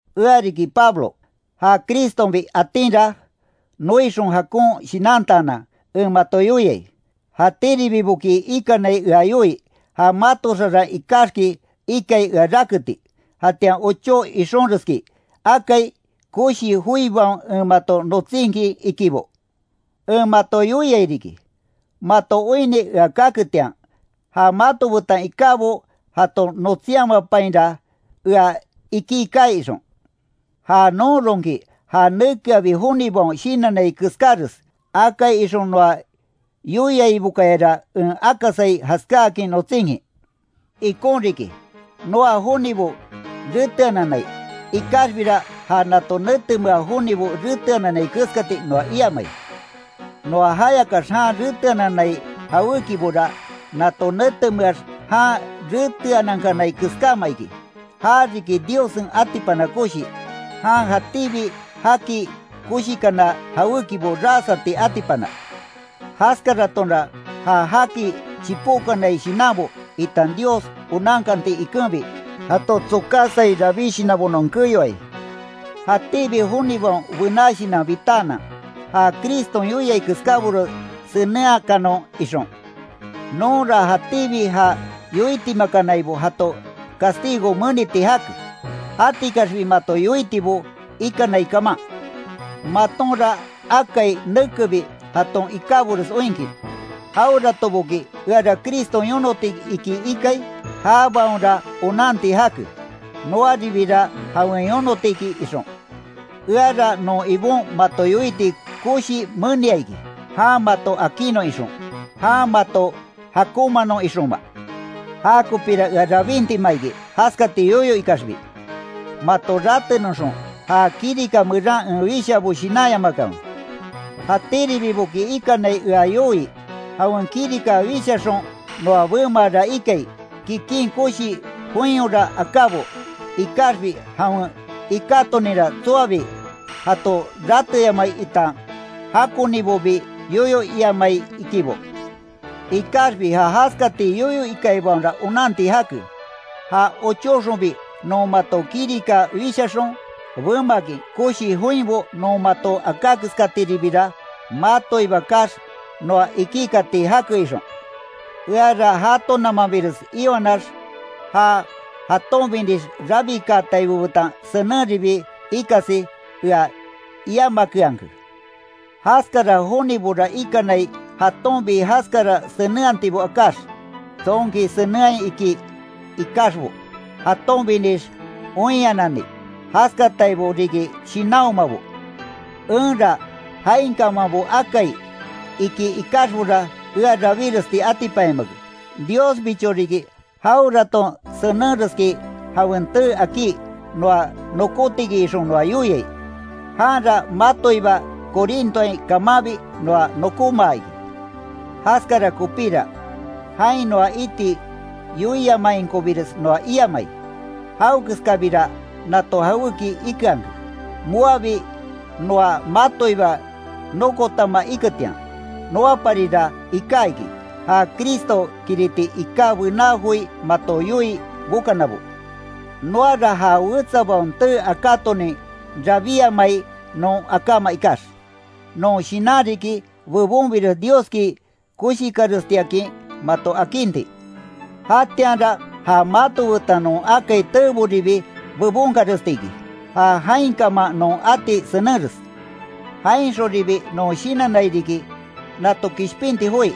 Ea riki Pablo, ja Cristonbi atinra, noixon jakon shinantaanan, en mato yoiai, jatíribiboki ikanai ea yoii, ja mato xaran ikaxki ikai ea raketi, jatian ochó ixonreski akai, koshi joibaon en mato notsinkin ikibo. En mato yoiai riki, mato oinni ea kaketian, ja mato betan ikábo jato notsinyamapainra ea iki kaai ixon. Ja nonronki, ja nekeabi jonibaon shinannai keskáres, akai ixon noa yoiaibokayara en akasai jaskáakin notsinkin. Ikon riki, noa jonibo reteananai, ikaxbira ja nato netemea jonibo reteananai keskati noa iamai. Noa jayakax jan reteananai jawékibora, nato netemeax jan reteanankanai keskáma iki; ja riki Diossen atipana koshi, jan jatíbi jaki koshikana jawékibo ras ati atipana, Jaskaratonra ja jaki chipókanai shinanbo, itan Dios onankanti ikenbi, jato tsokásai rabí shinanbo non keyoai; jatíbi jonibaon bená shinan bitaanan, ja Criston yoiai keskábores senenhakanon ixon. Nonra jatíbi ja yoitimakanaibo jato castigo meniti jake, jatikaxbi mato yoitibo ikanai kaman. Matonra akai nekebi, jaton ikábores oinkin, jaweratoboki eara Criston yonoti iki ikai, jabaonra onanti jake, noaribira jawen yonoti iki ixon. Eara non Ibon mato yoiti koshi menia iki, jan mato akinnon ixon, jan mato jakonmaanon ixonma. Jakopira ea rabintima iki, jaskati yoyo ikaxbi. Mato ratenoxon, ja kirika meran en wishaabo shinanyamakanwe. Jatíribiboki ikanai ea yoii, jawen kirika wishaxon noa bemaara ikai, kikin koshi joinyora akábo, ikaxbi jawen ikátoninra tsoabi, jato rateyamai itan jakonibobi yoyo iamai ikibo. Ikaxbi ja jaskati yoyo ikaibaonra onanti jake, ja ochóxonbi non mato kirika wishaxon, bemakin koshi joinbo non mato aká keskatiribira matoiba kaax, noa iki kati jake ixon. Eara jatonamanbires iwanax ja jatonbinix rabikaataibo betan senenribi ikasi ea iiamakeanke; jaskara jonibora ikanai jatonbi jaskara senenhatibo akáx, tsonki senenhai iki, ikaxbo jatonbinix oinhanani, jaskataibo riki shinanhomabo. Enra jainkamanbo akai, iki ikaxbora ea rabíresti atipanyamake, Diosbicho riki jaweraton senenreski jawen tee akí, noa nokótiki ixon noa yoiai, janra matoiba Corintoain kamanbi noa nokómaa iki. Jaskara kopíra, jain noa iti yoiamainkobires noa iiamai, jawekeskabira nato jawéki ikeanke, moabi noa matoiba nokotama iketian. Noaparira iká iki, ja Cristo kiriti iká bená joi mato yoii bokanabo. Noara ja wetsabaon tee akátonin rabíamai non akáma ikax. Non shinan riki, bebonbires Dioski koshikarestiakin mato akinti, jatianra ja mato betan non akai teeboribi bebonkarestiki, ja jainkaman non ati senenres. Jainxonribi non shinannai riki, nato kishpinti joi,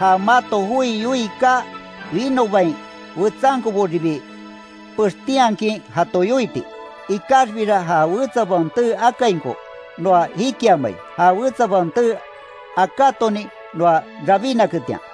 ja mato joi yoii kaa winobain wetsankoboribi pextinhakin jato yoiti, ikaxbira ja wetsabaon tee akainko, noa jikiamai, ja wetsabaon tee akatonin noa rabínaketian.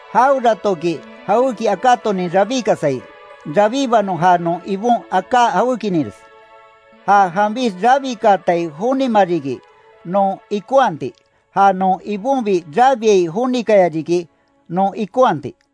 Jaweratoki jawéki akátonin rabíkasai, rabíbanon ja non Ibon aká jawékininres. Ja janbix rabikaatai jonima riki, non ikonhati, ja non Ibonbi rabiai jonikaya riki non ikonhati.